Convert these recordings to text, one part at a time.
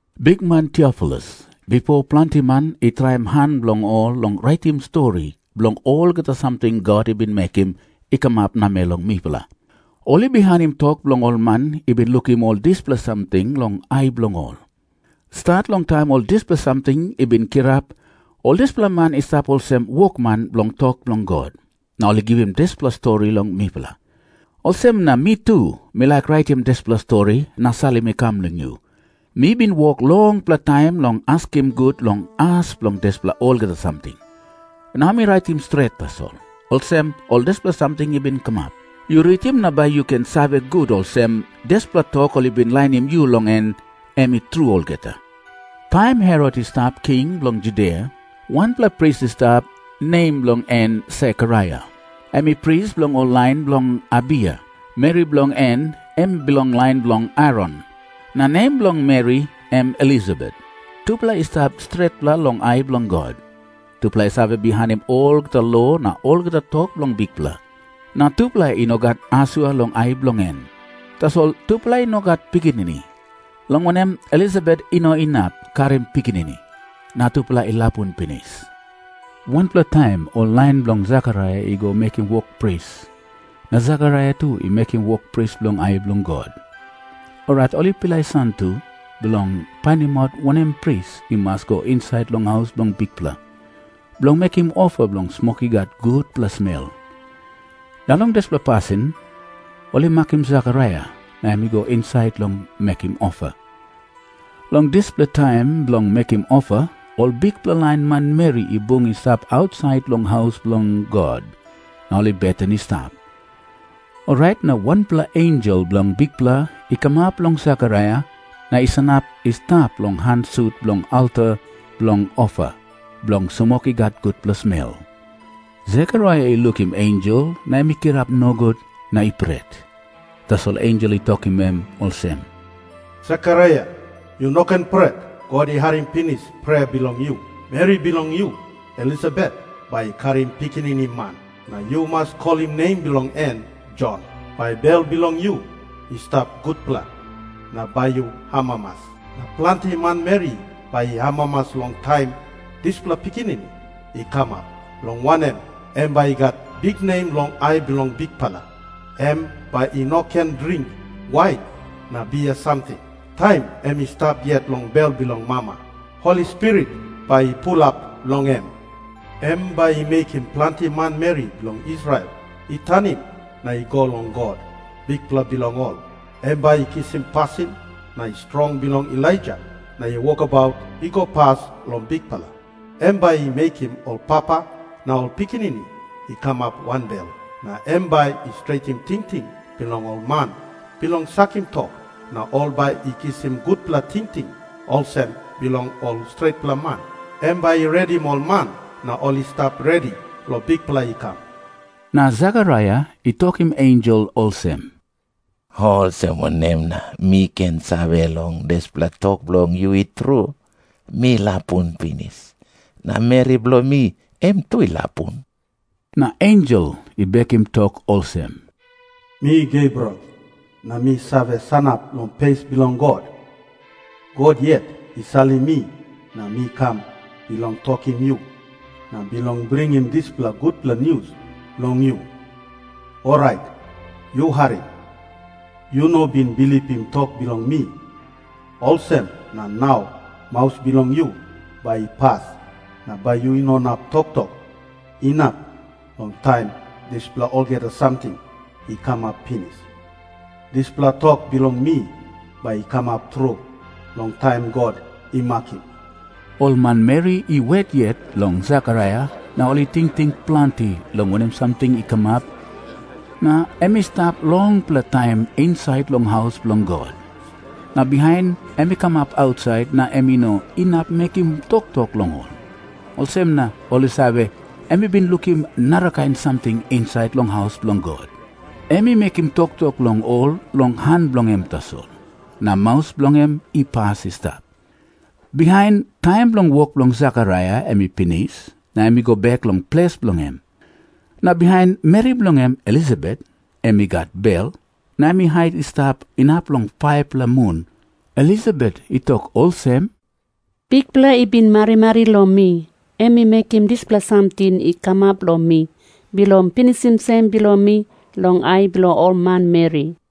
Bikman Tiofilus, bipo planti man i traim han bilong ol long raitim stori bilong olgeta samting God i bin mekim i kamap namel long mipela. Ol i bihainim tok bilong ol man i bin lukim ol dispela samting long ai bilong ol, stat long taim ol dispela samting i bin kirap. Ol dispela man i stap olsem wokman bilong tok bilong God, na ol i givim dispela stori long mipela. Olsem na mi tu mi laik raitim dispela stori na salim i kam long yu. Mi bin wok longpela taim long askim gut long as bilong dispela olgeta samting. Nau mi raitim stret tasol, olsem ol dispela samting i bin kamap. Yu ritim na bai yu ken save gut olsem, dispela tok ol i bin lainim yu long en, em i tru olgeta. Taim Herot i stap king bilong Judia, wanpela pris i stap, nem bilong en Sekaraia. Em i pris bilong ol lain bilong Abiya. Meri bilong en em i bilong lain bilong Aron, na nem bilong meri em Elisabet. Tupela i stap stretpela long ai bilong God. Tupela i save bihainim olgeta lo na olgeta tok bilong Bikpela, na tupela i no gat asua long ai bilong en. Tasol tupela i no gat pikinini, long wanem, Elisabet i no inap karim pikinini. Na tupela i lapun pinis. Wanpela taim ol lain bilong Sekaraia i go mekim wok pris, na Sekaraia tu i mekim wok pris long ai bilong God. Orait ol i pilai satu bilong painimaut wanem pris i mas go insait long haus bilong Bikpela, bilong mekim ofa bilong smok i gat gutpela smel. Na long dispela pasin ol i makim Sekaraia, na em i go insait bilong mekim ofa. Long dispela taim bilong mekim ofa, ol bikpela lain manmeri i bung i stap ausait long haus bilong God na ol i beten i stap. Orait na wanpela ensel bilong Bikpela i kamap long Sekaraia na i sanap i stap long han sut bilong alta bilong ofa bilong smok i gat gutpela smel. Sekaraia i lukim ensel na em i kirap nogut na i pret. Tasol ensel i tokim em olsem, “Sekaraia, yu no ken pret. God i harim pinis prea bilong yu. Meri bilong yu Elisabet bai i karim pikinini man. Na yu mas kolim nem bilong en Jon. Bai bel bilong yu i stap gutpela, na bai yu amamas. Na planti manmeri bai i amamas long taim dispela pikinini i kamap, long wanem, em bai i gat biknem long ai bilong Bikpela. Em bai i no ken dring wain na bia samting. Taim em i stap yet long bel bilong mama, Holi Spirit bai i pulap long em. Em bai i mekim planti manmeri bilong Israel i tanim na i go long God, Bikpela bilong ol. Em bai i kisim pasin na strong bilong Elaija na wokabaut i go pas long Bikpela. Em bai i mekim ol papa na ol pikinini i kamap wanbel. Na em bai i stretim tingting bilong ol man bilong sakim tok, na ol bai i kisim gutpela tingting olsem bilong ol stretpela man. Em bai i redim ol man na ol i stap redi long Bikpela i kam.” Na Sekaraia i tokim ensel olsem, “Olsem wanem na mi ken save dispela tok bilong yu i tru? Mi lapun pinis, na meri bilong mi em tu i lapun.” Na ensel i bekim tok olsem, “Mi Gebriel, na mi save sanap long pes bilong God. God yet i salim mi na mi kam bilong tokim yu, na bilong bringim dispela gutpela nius long yu. Orait yu harim. Yu no bin bilipim tok bilong mi, olsem na nau maus bilong yu bai i pas na bai yu no inap toktok, inap long taim dispela olgeta samting i kamap pinis. Dispela tok bilong mi bai i kamap tru long taim God i makim.” Ol manmeri i wet yet long Sekaraia, na ol i tingting planti long wanem samting i kamap na em i stap longpela taim insait long haus bilong God. Na bihain em i kam ausait na em i no inap mekim toktok long ol. Olsem na ol i save, em i bin lukim narakain samting insait long haus bilong God. Em i mekim toktok long ol long han bilong en tasol. Na maus bilong en i pas i stap. Bihain, taim bilong wok bilong Sekaraia em i pinis, na em i go bek long ples bilong en. Na bihain meri bilong en Elisabet em i gat bel. Na em i hait i stap inap long 5-pela mun. Elisabet i tok olsem, “Bikpela i bin marimari long mi. Em i mekim dispela samting i kamap long mi bilong pinisim sem bilong mi long ai bilong ol manmeri.”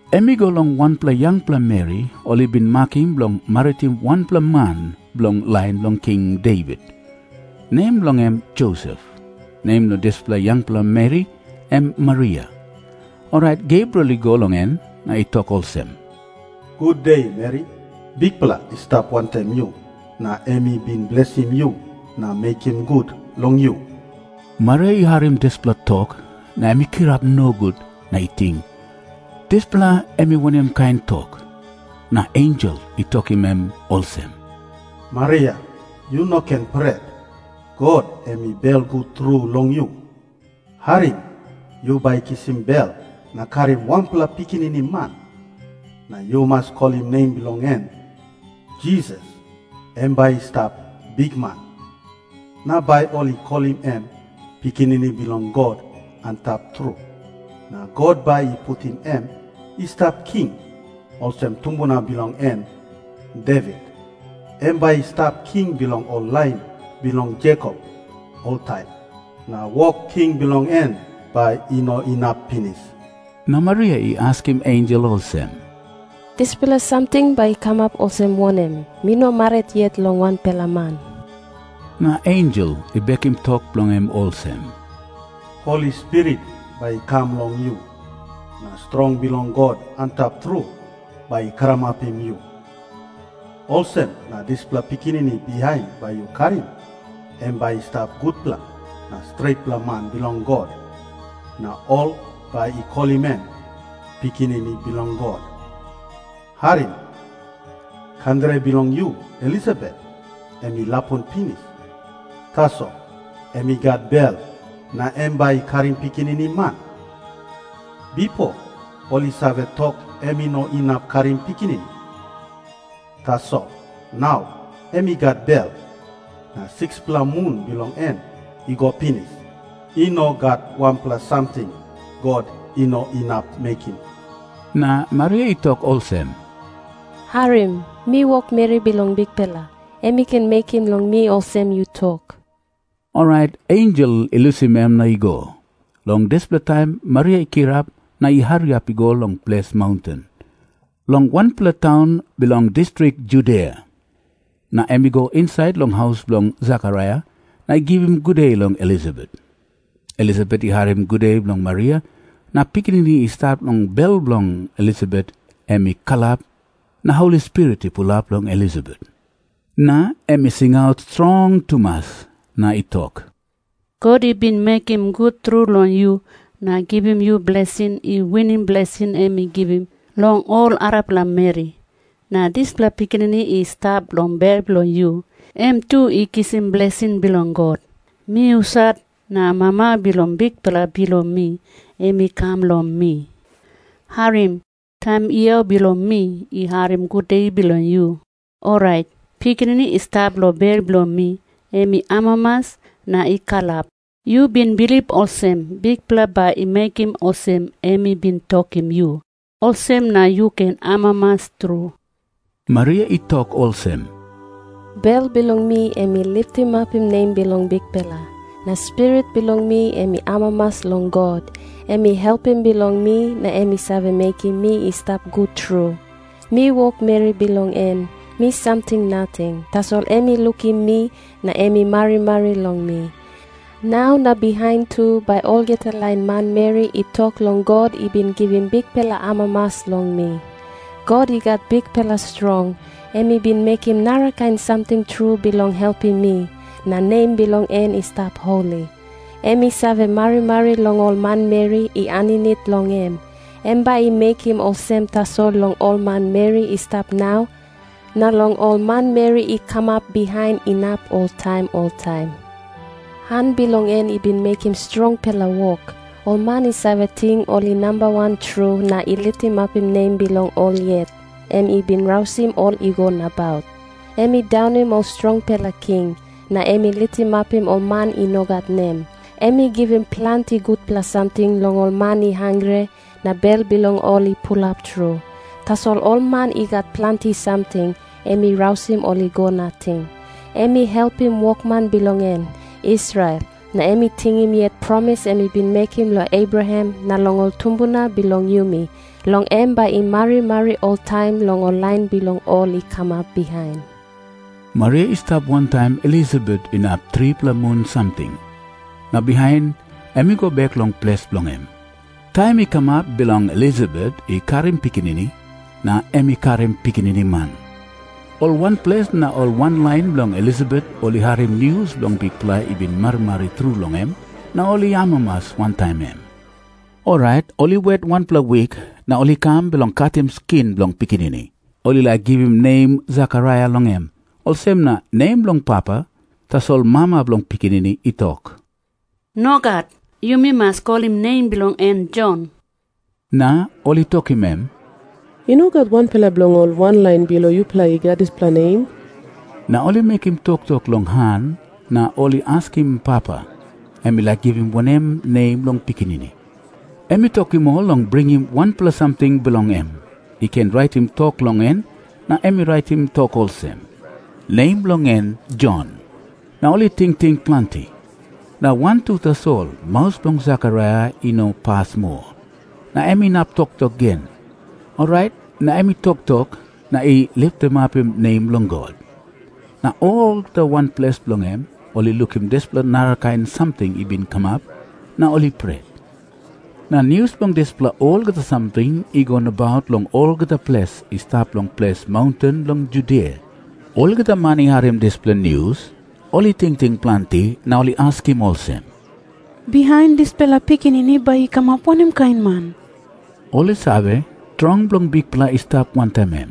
Em i go long wanpela yangpela meri ol i bin makim bilong maritim wanpela man bilong lain bilong King Devit, nem bilong en Josep. Nem bilong dispela yangpela meri em Maria. Orait Gebriel i go long em na i tok olsem, “Gude, meri. Bikpela i stap wantaim yu, na em i bin blesim yu na mekim gut long yu.” Maria i harim dispela tok, na em i kirap nogut na i ting, “Dispela em i wanem kain tok?” Na ensel i tokim em olsem, “Maria, yu no ken pret. God em i belgut tru long yu. Harim. Yu bai kisim bel na karim wanpela pikinini man. Na yu mas kolim nem bilong en Jisas. Em bai i stap bikman. Na bai ol i kolim em Pikinini bilong God Antap Tru. Na God bai i putim em i stap king olsem tumbuna bilong en Devit. Em bai i stap king bilong ol lain bilong Jekop oltaim. Na wok king bilong en bai i no inap pinis.” Na Maria i askim ensel olsem, “Dispela samting bai i kamap olsem wanem? Mi no marit yet long wanpela man.” Na ensel i bekim tok bilong en olsem, “Holi Spirit bai i kam long yu, na strong bilong God Antap Tru bai i karamapim yu. Olsem na dispela pikinini bihain bai yu karim, em bai i stap gutpela na stretpela man bilong God, na ol bai i kolim em Pikinini Bilong God. “Harim. Kandere bilong yu Elisabet em i lapun pinis, tasol em i gat bel na em bai i karim pikinini man. Bipo ol i save tok em i no inap karim pikinini. Tasol nau em i gat bel, na 6-pela mun bilong en i go pinis. I no gat wanpela samting God i no inap mekim.” Na Maria i tok olsem, “Harim. Mi wokmeri bilong Bikpela. Em i ken mekim long mi olsem yu tok.” Orait ensel i lusim em na i go. Long dispela taim Maria i kirap na i hariap i go long ples maunten, long wanpela taun bilong distrik Judia. Na em i go insait long haus bilong Sekaraia na i givim gude long Elisabet. Elisabet i harim gude bilong Maria, na pikinini i stap long bel bilong Elisabet em i kalap. Na Holi Spirit i pulap long Elisabet, na em i singaut strong tumas, na i tok, “God i bin mekim gut tru long yu na givim yu blesing i winim blesing em i givim long ol arapela meri. Na dispela pikinini i stap long bel bilong yu, em tu i kisim blesing bilong God. Mi husat na mama bilong Bikpela bilong mi em i kam long mi? Harim. Taim yau bilong mi i harim gude bilong yu, orait pikinini i stap long bel bilong mi em i amamas na i kalap. Yu bin bilip olsem Bikpela bai i mekim olsem em i bin tokim yu, olsem na yu ken amamas tru.” Maria i tok olsem, “Bel bilong mi em i litimapim nem bilong Bikpela. Na spirit bilong mi em i amamas long God, em i Helpim bilong mi na em i save mekim mi i stap gut tru. Mi wokmeri bilong en, mi samting nating, tasol em i lukim mi na em i marimari long mi. Nau na bihain tu bai olgeta lain manmeri i tok long God i bin givim bikpela amamas long mi. God i gat bikpela strong, em i bin mekim narakain samting tru bilong helpim mi, na nem bilong en i stap holi. Em i save marimari long ol manmeri i aninit long em. Em bai i mekim olsem tasol long ol manmeri i stap nau, na long ol manmeri i kamap bihain inap oltaim oltaim. Han bilong en i bin mekim strongpela wok. Ol man i save ting ol i nambawan tru na i litimapim nem bilong ol yet, em i bin rausim ol i go nabaut. Em i daunim ol strongpela king, na em i litimapim ol man i no gat nem. Em i givim planti gutpela samting long ol man i hangre, na bel bilong ol i pulap tru. Tasol ol man i gat planti samting, em i rausim ol i go nating. Em i helpim wokman bilong en, Israel, na em i tingim yet promis em i bin mekim long Abraham na long ol tumbuna bilong yumi, long em bai i marimari oltaim long ol lain bilong ol i kamap bihain.” Maria i stap wantaim Elisabet inap tripela mun samting, na bihain em i go bek long ples bilong en. Taim i kamap bilong Elisabet i karim pikinini, na em i karim pikinini man. Ol wanples na ol wanlain bilong Elisabet ol i harim nius long Bikpela i bin marimari tru long em, na ol i amamas wantaim em. Orait ol i wet wanpela wik, na ol i kam bilong katim skin bilong pikinini. Ol i laik givim nem Sekaraia long em, olsem nem bilong papa. Tasol mama bilong pikinini i tok, “Nogat. Yumi mas kolim nem bilong en Jon.” Na ol i tokim em, “I no gat wanpela bilong ol wanlain bilong yupela i gat dispela nem.” Na ol i mekim toktok long han, na ol i askim papa, em i laik givim wanem nem long pikinini. Em i tokim ol long bringim wanpela samting bilong em i ken raitim tok long en, na em i raitim tok olsem, “Nem bilong en Jon.” Na ol i tingting planti. Na wantu tasol maus bilong Sekaraia i no pas moa, na em inap toktok gen. Orait na em i toktok, na i litimapim nem bilong God. Na olgeta wanples bilong em, ol i lukim dispela narakain samting i bin kamap na ol i pret. Na nius bilong dispela olgeta samting i go nabaut long olgeta ples i stap long ples maunten bilong Judia. Olgeta man i harim dispela nius, ol i tingting planti na ol i askim olsem, “Bihain dispela pikinini bai i kamap wanem kain man?” Ol i save, strong bilong Bikpela i stap wantaim em.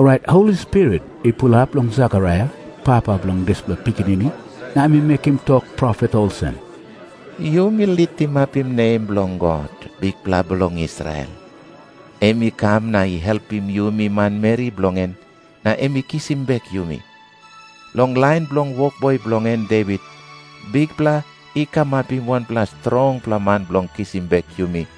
Orait Holi Spirit i pulap long Sekaraia, papa bilong dispela pikinini, na em i mekim tok profet olsem, “Yumi litimapim nem bilong God, Bikpela bilong Israel. Em i kam na i helpim yumi manmeri bilong en, na em i kisim bek yumi. Long lain bilong wokboi bilong en Devit, Bikpela i kamapim wanpela strongpela man bilong kisim bek yumi,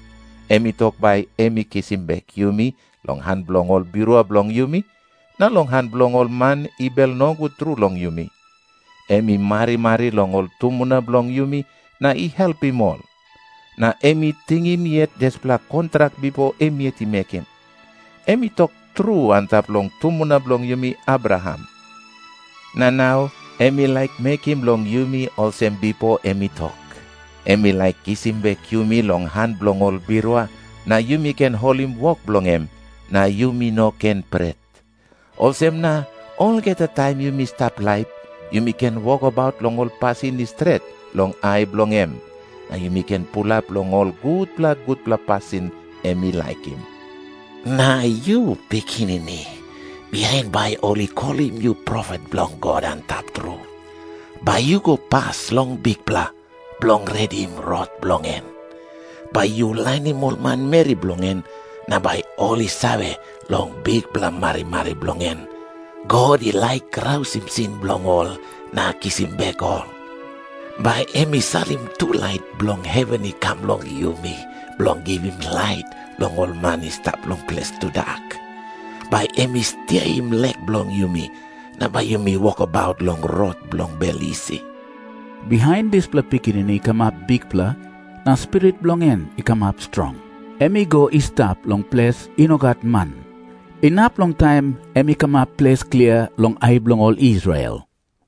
Em i tok bai em i kisim bek yumi long han bilong ol birua bilong yumi, na long han bilong ol man i bel nogut tru long yumi. Em i marimari long ol tumbuna bilong yumi na i helpim ol. Na em i tingim yet dispela kontrak bipo em yet i mekim. Em i tok tru antap long tumbuna bilong yumi Abraham. Na nau em i laik mekim long yumi olsem bipo em i tok. Em i laik kisim bek yumi long han bilong ol birua, na yumi ken holim wok bilong em, na yumi no ken pret. Olsem na olgeta taim yumi stap laip, yumi ken wokabaut long ol pasin i stret long ai bilong em, na yumi ken pulap long ol gutpela gutpela pasin em i laikim. Na yu, pikinini, bihain bai ol i kolim yu profet bilong God Antap Tru. Bai yu go pas long Bikpela, bilong redim rot bilong en. Bai yu lainim ol manmeri bilong en na bai ol i save, long bikpela marimari bilong en, God i laik rausim sin bilong ol na kisim bek ol. Bai em i salim tulait bilong heven i kam long yumi, bilong givim lait long ol man i stap long ples tudak. Bai em i stiaim lek bilong yumi, na bai yumi wokabaut long rot bilong bel isi.” Bihain dispela pikinini i kamap bikpela, na spirit bilong en i kamap strong. Em i go i stap long ples i no gat man, inap long taim em i kamap ples klia long ai bilong ol Israel.